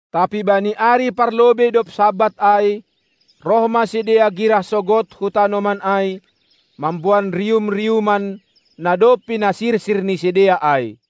Tapi bani ari parlobei dob Sabat ai, roh ma sidea girah sogod hu tanoman ai mamboan rium-riuman, na dob pinasirsir ni sidea ai.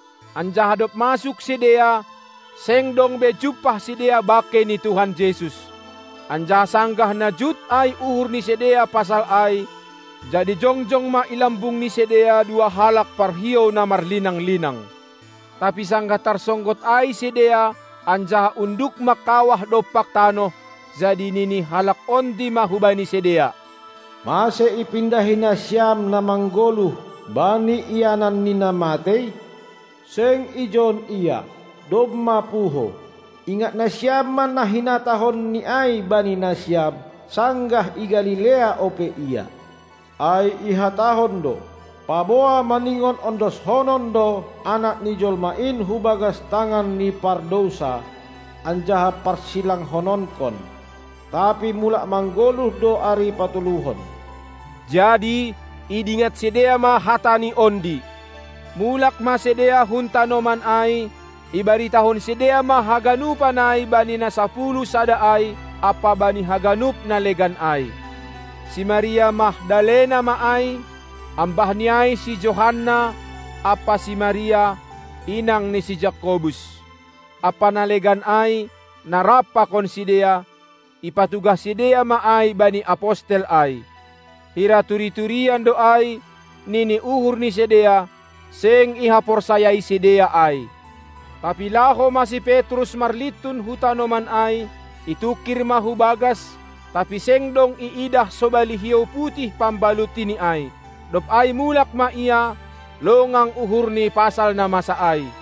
Anjaha dob masuk sidea, seng dong be jumpah sidea bangkei ni Tuhan Jesus. Anjaha sanggah na jut ai uhur ni sidea pasal ai, jadi jongjong ma i lambung ni sidea dua halak parhiou na marlinang-linang. Tapi sanggah tarsonggot ai sidea anjaha unduk mangkawah dompak tanoh, jadi nini halak ondi ma hubani sidea: Mase ipindahi nasiam na manggoluh bani ianan ni na matei? Seng ijon Ia, domma puho. Ingat nasiam ma na hinatahonNi ai bani nasiam, sanggah i Galilea ope Ia. Ai ihatahon do, paboa maningon ondoshonon do Anak ni jolma in hubagas tangan ni pardousa anjaha parsilangkononkon, tapi mulak manggoluh do ari patoluhon. Jadi idingat sidea ma hataNi ondi. Mulak ma sidea hun tanoman ai, ibaritahon sidea ma haganupan ai bani na sapuluh sada ai ampa bani haganup na legan ai. Si Maria Magdalena ma ai, ambahni ai si Johanna ampa si Maria, inang ni si Jakobus, ampa na legan ai na rap pakon sidea, ipatugah sidea ma ai bani apostel ai. Hira turi-turian do ai, nini uhur ni sidea, seng ihaporsayai sidea ai. Tapi laho ma si Petrus marlintun hu tanoman ai, itungkir ma hubagas, tapi seng dong iidah sobali hiou putih pambalutini ai. Dob ai mulak ma ia, longang uhurni pasal na masa ai.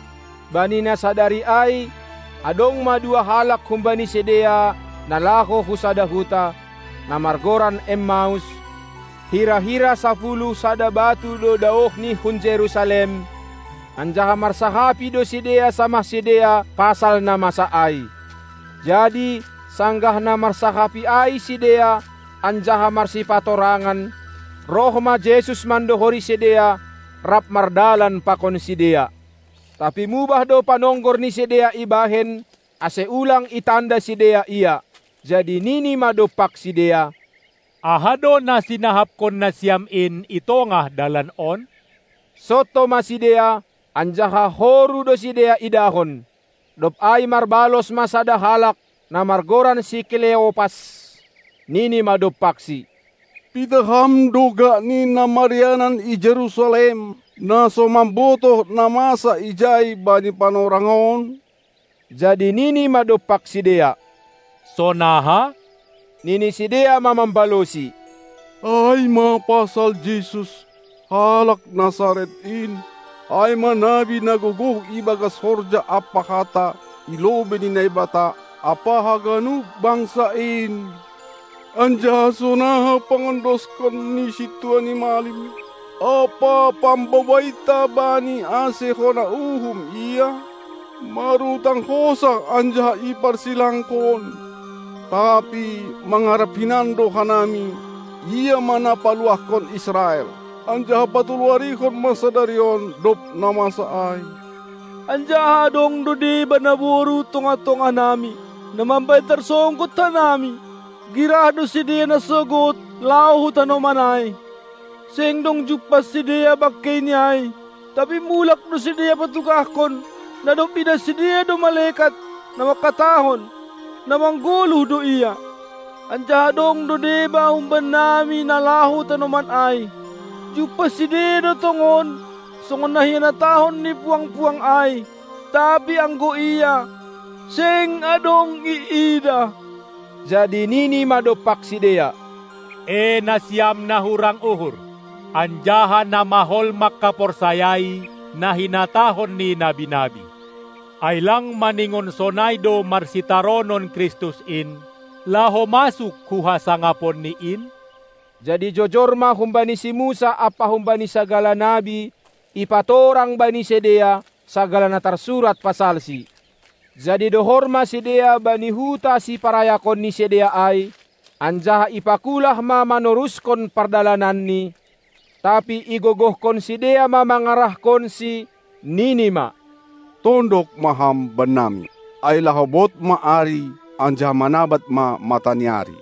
Bani na sadari ai adong ma dua halak humbani sidea na laho hu sada huta, na margoran Emmaus, hira-hira sapuluh sada batu do daohni hun Jerusalem, anjaha marsahapi do sidea samah sidea pasal na masa ai. Jadi sanggah na marsahapi ai sidea anjaha marsipatorangan, roh ma Jesus mandohori sidea, rap mardalan pakon sidea. Tapi mubah do panonggor ni sidea ibahen, ase ulang itanda sidea Ia. Jadi nini ma dompak sidea: Aha do na sinahapkon nasiam in i tongah dalan on? Sonto ma sidea, anjaha horu do sidea idahon. Dob ai marbalos ma sada halak, na margoran si Kleopas, nini ma dompakSi: Pitah Ham do gakni na marianan i Jerusalem na so mambotoh na masa ijai bani panorang on? Jadi nini ma dompak sidea: Sonaha? Nini sidea ma mambalosi: Ai ma pasal Jesus, halak Nasaret in, ai ma nabi na gogoh ibagas horja ampa hata i lobei ni Naibata ampa haganup bangsa in, anjaha sonaha pangondoskon ni sintua ni malim ampa pambobainta Bani ase hona uhum Ia, marutang hosah anjaha iparsilangkon. Tapi mangarap hinan do hanami, Ia ma na paluahkon Israel. Anjaha patolu-arihon ma sadari on, dob na masa ai. Anjaha adong do deba naboru hun tongah-tongah nami, na mambahen tarsonggot hanami, girah do sidea nasogod laho hu tanoman ai. Seng dong jumpah sidea bangkeiNi ai, tapi mulak do sidea patugahkon, na dob iidah sidea do malekat, na mangkatahon, na manggoluh do Ia. Anjaha dong do deba humbannami na laho hu tanoman ai; jumpah sidea do tongon songon na hinatahon ni puang-puang ai, tapi anggo Ia, seng adong iidah. Jadi nini ma dompak sidea: E nasiam, na hurang uhur, anjaha na mahol mangkaporsayai na hinatahon ni nabi-nabi! Ai lang maningon sonai do marsitaronon Kristus in, laho masuk hu hasangaponNi in? Jadi jojor ma humbani si Musa ampa humbani sagala nabi ipatorang bani sidea sagala na tarsurat pasalSi. Jadi dohor ma sidea bani huta siparayakon ni sidea ai, anjaha ipakulah ma manorushon pardalananNi, tapi igogohkon sidea ma mangarahkonSi, nini ma: Tondok ma Ham bannami, ai laho bod ma ari anjaha manabad ma mata ni ari!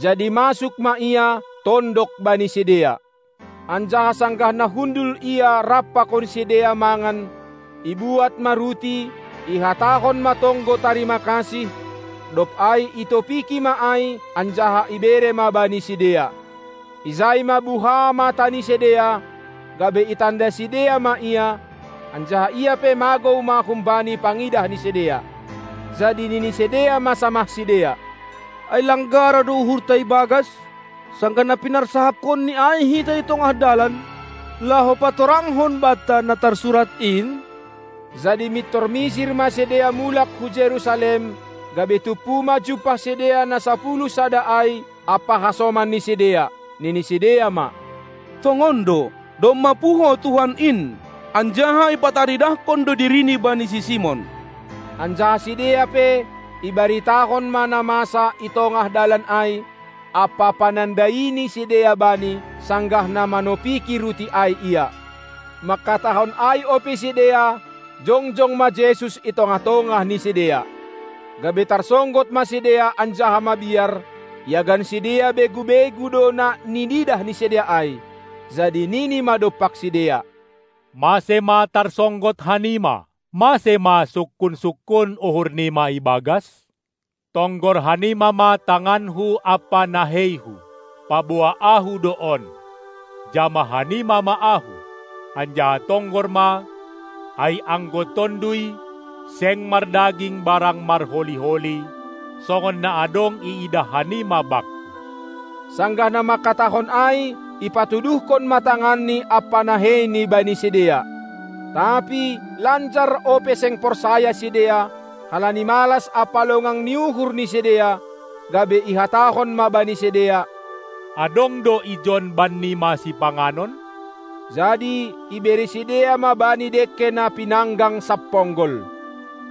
Jadi masuk ma Ia, tondok bani sidea. Anjaha sanggah na hundul Ia rap pakon sidea mangan, ibuat ma ruti, ihatahon ma tonggo tarima-kasih, dob ai itopiki ma ai anjaha ibere ma bani sidea. Ijai ma buka mata ni sidea, gabe itanda sidea ma Ia; anjaha Ia pe magou ma humbani pangidah ni sidea. Jadi nini sidea ma samah sidea: Ai lang gara do uhurta ibagas, sanggah na pinarsahapkonNi ai hita i tongah dalan, laho patorangkon banta na tarsurat in? Jadi mintor misir ma sidea mulak hu Jerusalem, gabe tumpu ma jumpah sidea na sapuluh sada ai ampa hasoman ni sidea. Nini sidea ma: Tongon do, domma puho Tuhan in, anjaha ipataridahkon do diriNi bani si Simon! Anjaha sidea pe ibaritahon ma na masa itongah dalan ai, ampa panandai ni sidea Bani, sanggah na manopiki ruti ai Ia. Mangkatahon ai ope sidea, jongjong ma Jesus i tongah-tongah ni sidea. Gabe tarsonggot ma sidea anjaha mabiar, iagan sidea begu-begu do na niidah ni sidea ai. Jadi nini ma dompak sidea: Mase ma tarsonggot hanima? Mase ma sungkun-sungkun uhur nima ibagas? Tonggor hanima ma tanganKu ampa naheiHu, paboa Ahu do on. Jamah hanima ma Ahu, anjaha tonggor ma, ai anggo tonduy seng mardaging barang marholi-holi, songon na adong iidah hanima Bakku. Sanggah na mangkatahon ai ipatuduhkon ma tanganNi ampa naheiNi bani sidea. Tapi lanjar ope seng porsaya sidea, halani malas ampa longang ni uhur ni sidea, gabe ihatahon ma bani sidea: Adong do ijon bannima sipanganon? Jadi ibere sidea ma Bani dengke na pinanggang samponggol.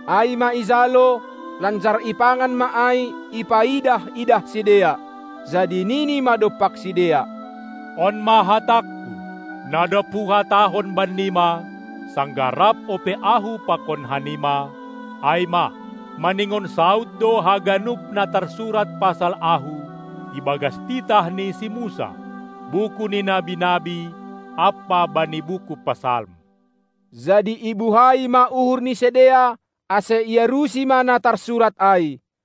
Ai ma ijalo, lanjar ipangan ma ai ipaidah-idah sidea. Jadi nini ma dompak sidea: On ma hatangKu, na dob Huhatahon bannima, sanggah rap ope Ahu pakon hanima, ai ma, maningon saud do haganup na tarsurat pasal Ahu ibagas titah ni si Musa, buku ni nabi-nabi ampa bani buku Psalm. Jadi ibuhai ma uhur ni sidea, ase iarusi ma na tarsurat ai.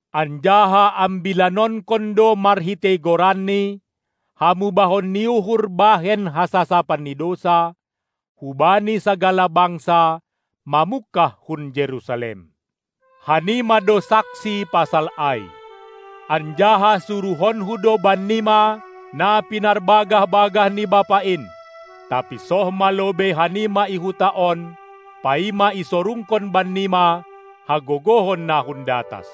Anjaha ambilanonkon do marhitei GoranNi hamubahon ni uhur bahen hasasapan ni dousa, hubani sagala bangsa, mamungkah hun Jerusalem. Hanima do saksi pasal ai. Anjaha suruhonKu do bennima na pinarbagah-bagah ni Bapa in. Tapi soh ma lobei hanima i huta on, paima isorungkon bannima hagogohon na hun datas.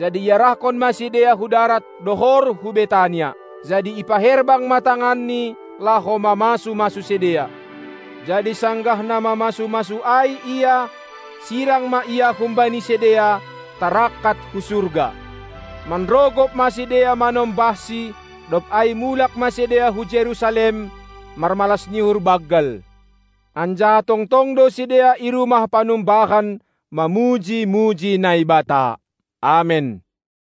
Jadi iarahkon ma sidea hu darat, dohor hu Betania. Jadi ipaherbang ma tanganNi laho mamasu-masu sidea. Jadi sanggah na mamasu-masu ai Ia, sirang ma Ia humbani sidea, tarangkat hu surga. Manrogop ma sidea manombahsi, dob ai mulak ma sidea hu Jerusalem, marmalas ni uhur banggal. Anjaha tongtong do sidea i rumah panumbahan mamuji-muji Naibata. Amen.